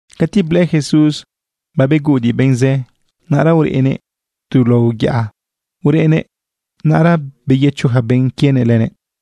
Cati blëꞌë Jesús babeguꞌudiꞌ benꞌ zë, naꞌra urënëꞌ tu lao yaꞌa ureꞌnëꞌ. Naꞌra beyëcho ja benꞌ quienëꞌ lënëꞌ.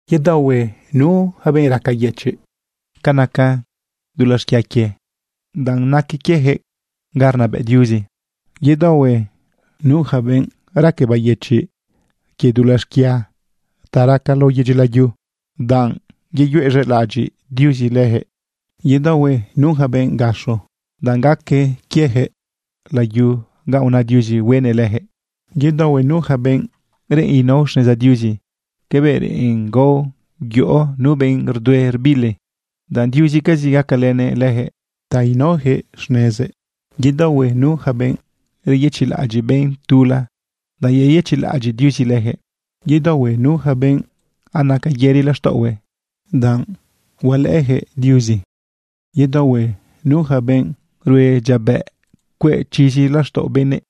―Yedaohue nu yaca benꞌ raca yëchiꞌ ca naca dulaꞌ xquia quie, danꞌ naque quiejëꞌ ga rnabëꞌ Diuzi. Yedaohue nu yaca benꞌ raque bayëchiꞌ quie dulaꞌ xquia ta raca lao yedyi layu, danꞌ yeyuez̃elaꞌadyiꞌ Diuzi lëjëꞌ. ’Yedaohue nu yaca benꞌ gaxo, danꞌ gaque quieyaquëꞌ layu ganꞌ una Diuzi hueꞌnëꞌ lëjëꞌ. ’Yedaohue nu yaca benꞌ reꞌen inao xneza Diuzi cabëꞌ reꞌen gao yoꞌo nu benꞌ rdue rbili, danꞌ Diuzicazi gacalënëꞌ lëjëꞌ ta inaoyaquëꞌ xnezëꞌ. ’Yedaohue nu yaca benꞌ reyëchiꞌlaꞌadyiꞌ benꞌ tula, danꞌ yeyëchiꞌlaꞌadyiꞌ Diuzi lëjëꞌ. ’Yedaohue nu yaca benꞌ anaca yëri laxtaꞌohue, danꞌ hualëꞌëyaquëꞌ Diuzi. ’Yedaohue nu yaca benꞌ rue dyiabëꞌ cueꞌ chizi laxtaꞌo benëꞌ,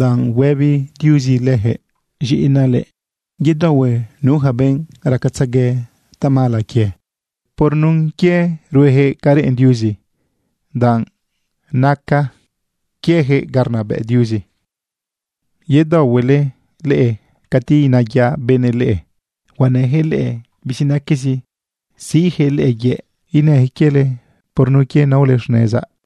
danꞌ huëbi Diuzi leyaquëꞌ: “Z̃iꞌinaꞌ leꞌe.” ’Yedaohue nu yaca benꞌ racatzegue tamala quie por nun quie ruejëꞌ ca reꞌen Diuzi, danꞌ naque quiejëꞌ ga rnabëꞌ Diuzi. ’Yedaohuele leꞌe cati inayaꞌ benëꞌ leꞌe huenëjëꞌ leꞌe bizinaquezi, siꞌjëꞌ leꞌe yëꞌ, inëjëꞌ quiele por nun quie naole xnezaꞌ.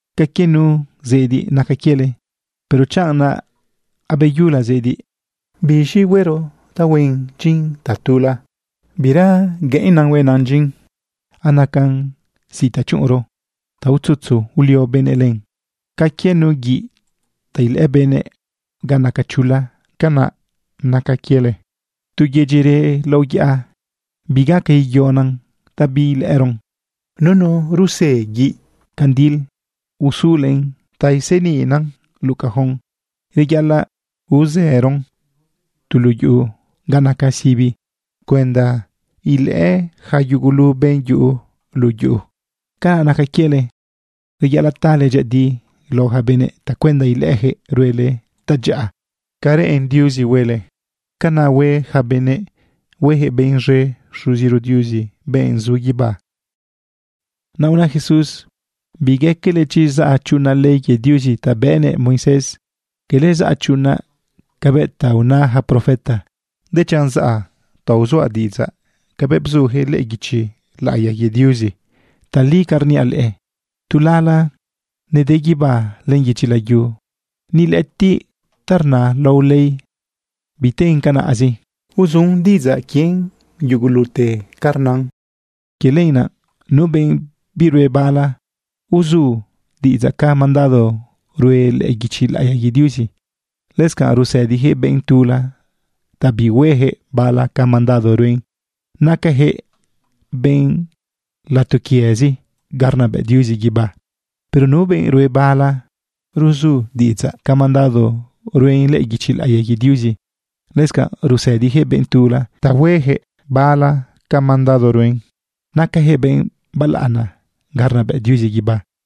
―Ca quie nu zediꞌ naca quiele. Pero chanꞌ naꞌ abeyula zediꞌ, ¿biz̃i huero ta huen dyin tatula? Bira gueꞌennan huenan dyin. Anacan zi ta chuꞌunron ta utzutzu ulio benëꞌ len. ’Ca quie nu guiꞌ ta ilëꞌë benëꞌ ga naca chula, canaꞌ naca quiele. Tu yedyi reꞌ lao yaꞌa, bigaca igüiꞌonan ta biilëꞌëron. Nunu rusë guiꞌ candil uzulen ta iseniꞌna luꞌu cajón. Reyaꞌalaꞌ uzëron tu luꞌu yuꞌu ga naca sibi cuenda ilëꞌë ja yugulu benꞌ yuꞌu luꞌu yuꞌu. Canaꞌ naca quiele, reyaꞌalaꞌ tale dyëꞌëdi lao ja benëꞌ tacuenda ilëꞌëjëꞌ ruele tadyaꞌa ca reꞌen Diuzi huele. Canaꞌ hue ja benëꞌ, huejëꞌ benꞌ z̃e Xuziro Diuzi, benꞌ zu guibá. Naꞌ una Jesús: ―Bigaquele chi zaꞌa chuꞌunaꞌ ley quie Diuzi ta bëꞌnëꞌ Moisés. Quele zaꞌa chuꞌunaꞌ cabëꞌ ta una ja profeta, dechanꞌ zaꞌa ta uzuaꞌ diꞌidzaꞌ cabëꞌ bzujëꞌ lëꞌë guichi laꞌiya quie Diuzi. Tali ca rniaꞌ leꞌe, tu lala nede guibá len yedyi layu, ni lëꞌëtiꞌ ta rna lao ley biten canaꞌzi. Uzu diꞌidzaꞌ quien yugulute ca rnan. Quie lenaꞌ nu benꞌ birue bala ruzu diꞌidzaꞌ ca mandado rue lëꞌë guichi laꞌiya quie Diuzi, lëscanꞌ rusëdijëꞌ benꞌ tula ta bihuejëꞌ bala ca mandado ruen, nacajëꞌ benꞌ latoquiëzi ga rnabëꞌ Diuzi guibá. Pero nu benꞌ rue bala ruzu diꞌidzaꞌ ca mandado rue lëꞌë guichi laꞌiya quie Diuzi, lëscanꞌ rusëdijëꞌ benꞌ tula ta huejëꞌ bala ca mandado ruen, nacajëꞌ benꞌ balaꞌana ga rnabëꞌ Diuzi guibá.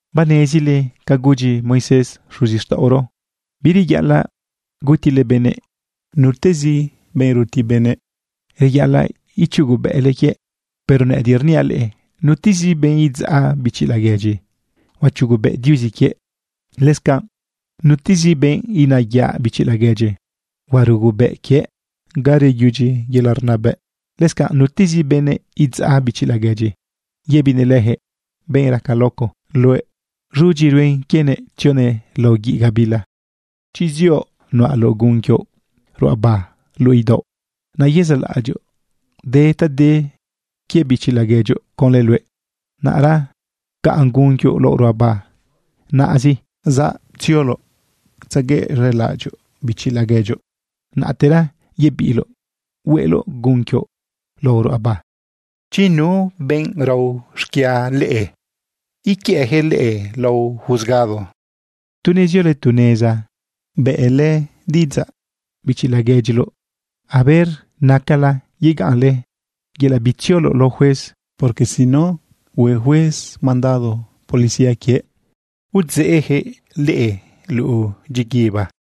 ―Banezile ca gudyi Moisés xuzixtaꞌoro: “Bireyaꞌalaꞌ gutile benëꞌ. Nutezi benꞌ ruti benëꞌ, reyaꞌalaꞌ ichugobëꞌle quiëꞌ.” Pero nëꞌëdiꞌ rniaꞌ leꞌe, nutezi benꞌ idzaꞌ bichi laguedyi, huachugobëꞌ Diuzi quiëꞌ. Lëscanꞌ nutezi benꞌ inayaꞌ bichi laguedyi, huarugobëꞌ quiëꞌ ga reyudyi yelaꞌ rnabëꞌ. Lëscanꞌ nutezi benëꞌ idzaꞌ bichi laguedyi yëbinëꞌ lëjëꞌ: “Benꞌ raca loco luëꞌ” z̃udyizi ruen quienëꞌ tzionëꞌ lao guiꞌ gabila. ’Chi zioꞌ nuꞌaloꞌ gun quioꞌ ruꞌaba luꞌu idaoꞌ, naꞌ yezaꞌlaꞌadyoꞌ de ta de quie bichi laguedyoꞌ conlë luëꞌ, naꞌra pcaꞌn gun quioꞌ lao ruꞌaba naꞌzi, zatzioloꞌ tzeguëꞌz̃elaꞌadyoꞌ bichi laguedyoꞌ. Naꞌtera yebiꞌloꞌ hueꞌloꞌ gun quioꞌ lao ruꞌaba. ’Chi nu benꞌ rao xquia leꞌe, iquiëꞌjëꞌ leꞌe lao juzgado, tu neziole tu neza, bëꞌlë diꞌidzaꞌ bichi laguedyile, a ver nacala yegaꞌnle yelaꞌ bitziole lao juez. Porque si no, hue juez mandado policía quiëꞌ, udzeꞌjëꞌ leꞌe luꞌu dyiguiba.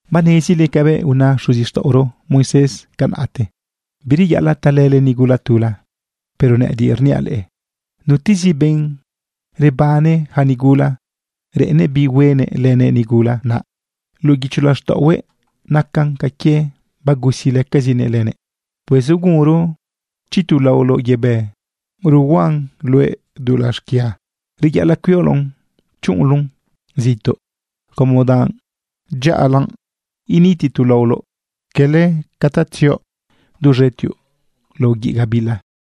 ―Banezile cabëꞌ una xuzixtaꞌoro Moisés canaꞌte: “Bireyaꞌalaꞌ talële nigula tula.” Pero nëꞌëdiꞌ rniaꞌ leꞌe, nutezi benꞌ rebane ja nigula reꞌennëꞌ bi huenëꞌ lënëꞌ nigula, naꞌ luꞌu guicho laxtaꞌohuëꞌ nacan ca quie bagusilëcazinëꞌ lënëꞌ. ’Pues ugunro chi tu laoloꞌ yebë ruhuaꞌn luëꞌ dulaꞌ xquia, reyaꞌalaꞌ cuioloꞌn chuꞌunloꞌn zituꞌ, como danꞌ dyaꞌalanꞌ initi tu laoloꞌ, quele ca ta tzioꞌ duz̃etioꞌ lao guiꞌ gabila.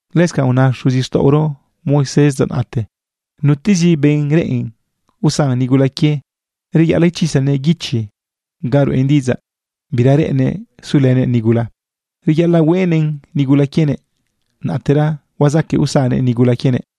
―Lëscanꞌ una xuzixtaꞌoro Moisés dza naꞌte: “Nutezi benꞌ reꞌen usan nigula quie, reyaꞌalaꞌ ichisanëꞌ guichi ga ruꞌen diꞌidzaꞌ bira reꞌennëꞌ sulënëꞌ nigula. Reyaꞌalaꞌ hueꞌnëꞌn nigula quienëꞌ, naꞌtera huazaquëꞌ usannëꞌ nigula quienëꞌ.”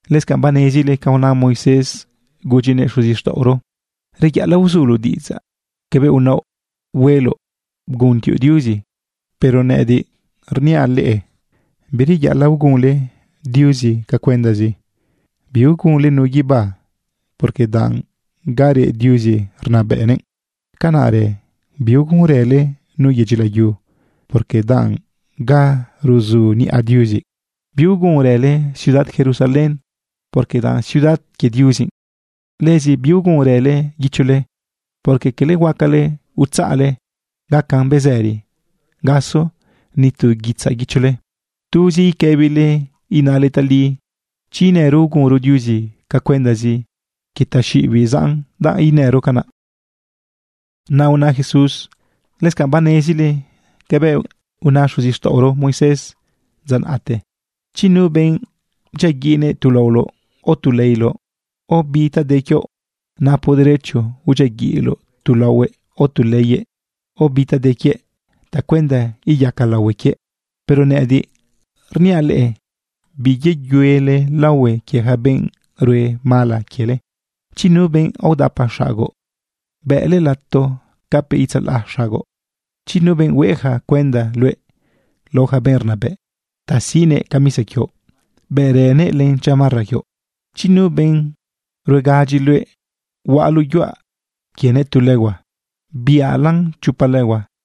―Lëscanꞌ banezile ca una Moisés gudyinëꞌ xuzixtaꞌoro: “Reyaꞌalaꞌ uzuloꞌ diꞌidzaꞌ cabëꞌ unaoꞌ hueloꞌ bguntioꞌ Diuzi.” Pero nëꞌëdiꞌ rniaꞌ leꞌe, bireyaꞌalaꞌ ugunle Diuzi ca cuendazi. Biugunle nu guibá, porque danꞌ ga reꞌ Diuzi rnabëꞌnëꞌ. Canaꞌrë biugunrële nu yedyi layu, porque danꞌ ga ruzu niꞌa Diuzi. Biugunrële ciudad Jerusalén, porque danꞌ ciudad quie Diuzi. Lëzi biugunrële guichole, porque quele huacale utzaꞌle gacan bezëri gaso ni tu guitzaꞌ guichole. Tuzi iquëbile inale tali. Chi inëro ugunro Diuzi ca cuendazi, quie taxiꞌibiꞌ zaꞌn danꞌ rnëro canaꞌ. Naꞌ una Jesús: ―Lëscanꞌ banezile cabëꞌ una xuzixtaꞌoro Moisés dza naꞌte: “Chi nu benꞌ bdyiaguiꞌnëꞌ tu laoloꞌ, o tu leiloꞌ, o bi ta de quioꞌ, napoꞌ derecho udyiaguiꞌloꞌ tu laohuëꞌ, o tu leiyëꞌ, o bi ta de quiëꞌ tacuenda iyaca laohue quiëꞌ.” Pero nëꞌëdiꞌ rniaꞌ leꞌe: Biyeyuele laohue quie ja benꞌ rue mala quiele. Chi nu benꞌ aodapa xagoꞌ, bëꞌle lato capëꞌ itzalaꞌ xagoꞌ. Chi nu benꞌ hueja cuenda luëꞌ lao ja benꞌ rnabëꞌ ta siꞌnëꞌ camisa quioꞌ, bëꞌrënëꞌ len chamarra quioꞌ. Chi nu benꞌ ruegadyi luëꞌ huaꞌaloꞌ yuaꞌ quienëꞌ tu legua, biꞌalan chopa legua.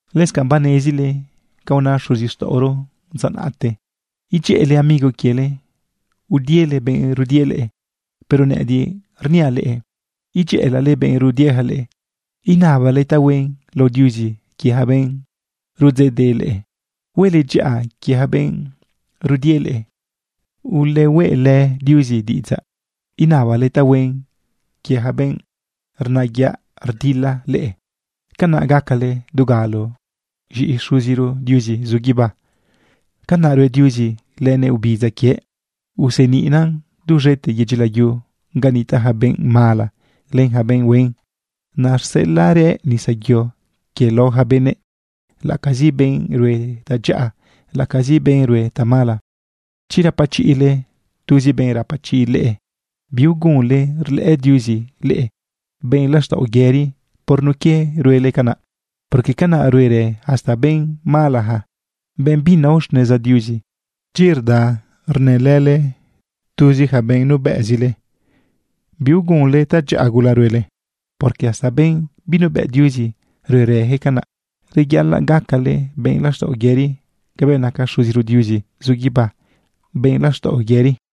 ―Lëscanꞌ banezile ca una xuzixtaꞌoro dza naꞌte: “Edyëꞌële amigo quiele, udiele benꞌ rudie leꞌe.” Pero nëꞌëdiꞌ rniaꞌ leꞌe: Edyëꞌëlale benꞌ rudieja leꞌe. Inabale tahuen lao Diuzi quie ja benꞌ rudzeꞌdeꞌ leꞌe. Huele dyaꞌa quie ja benꞌ rudie leꞌe. Ulehueꞌlë Diuzi diꞌidzaꞌ inabale tahuen quie ja benꞌ rnayaꞌ dilalë leꞌe. Canaꞌ gacale dugalo z̃iꞌi Xuziro Diuzi zu guibá. Canaꞌ rue Diuzi lënëꞌ obidza quiëꞌ. Useniꞌnan duz̃ete yedyi layu ga nitaꞌ ja benꞌ mala len ja benꞌ huen. Naꞌ rseꞌelaꞌrëꞌ nisa yo quiëꞌ lao ja benëꞌ, laꞌacazi benꞌ rue tadyaꞌa, laꞌacazi benꞌ rue tamala. Chi rapachiꞌle tuzi benꞌ rapachiꞌ leꞌe, biugunle rlëꞌë Diuzi leꞌe benꞌ laxtaꞌo yëri por nun quie ruele canaꞌ. Porque canaꞌ ruerë hasta benꞌ malaja, benꞌ binao xneza Diuzi. Chi rda rnëlële tuzi ja benꞌ nubëꞌzile, biugunle tadyaꞌa gula ruele. Porque hasta benꞌ binuebëꞌ Diuzi ruerëjëꞌ canaꞌ. Reyaꞌalaꞌ gacale benꞌ laxtaꞌo yëri cabëꞌ naca Xuziro Diuzi zu guibá benꞌ laxtaꞌo yëri.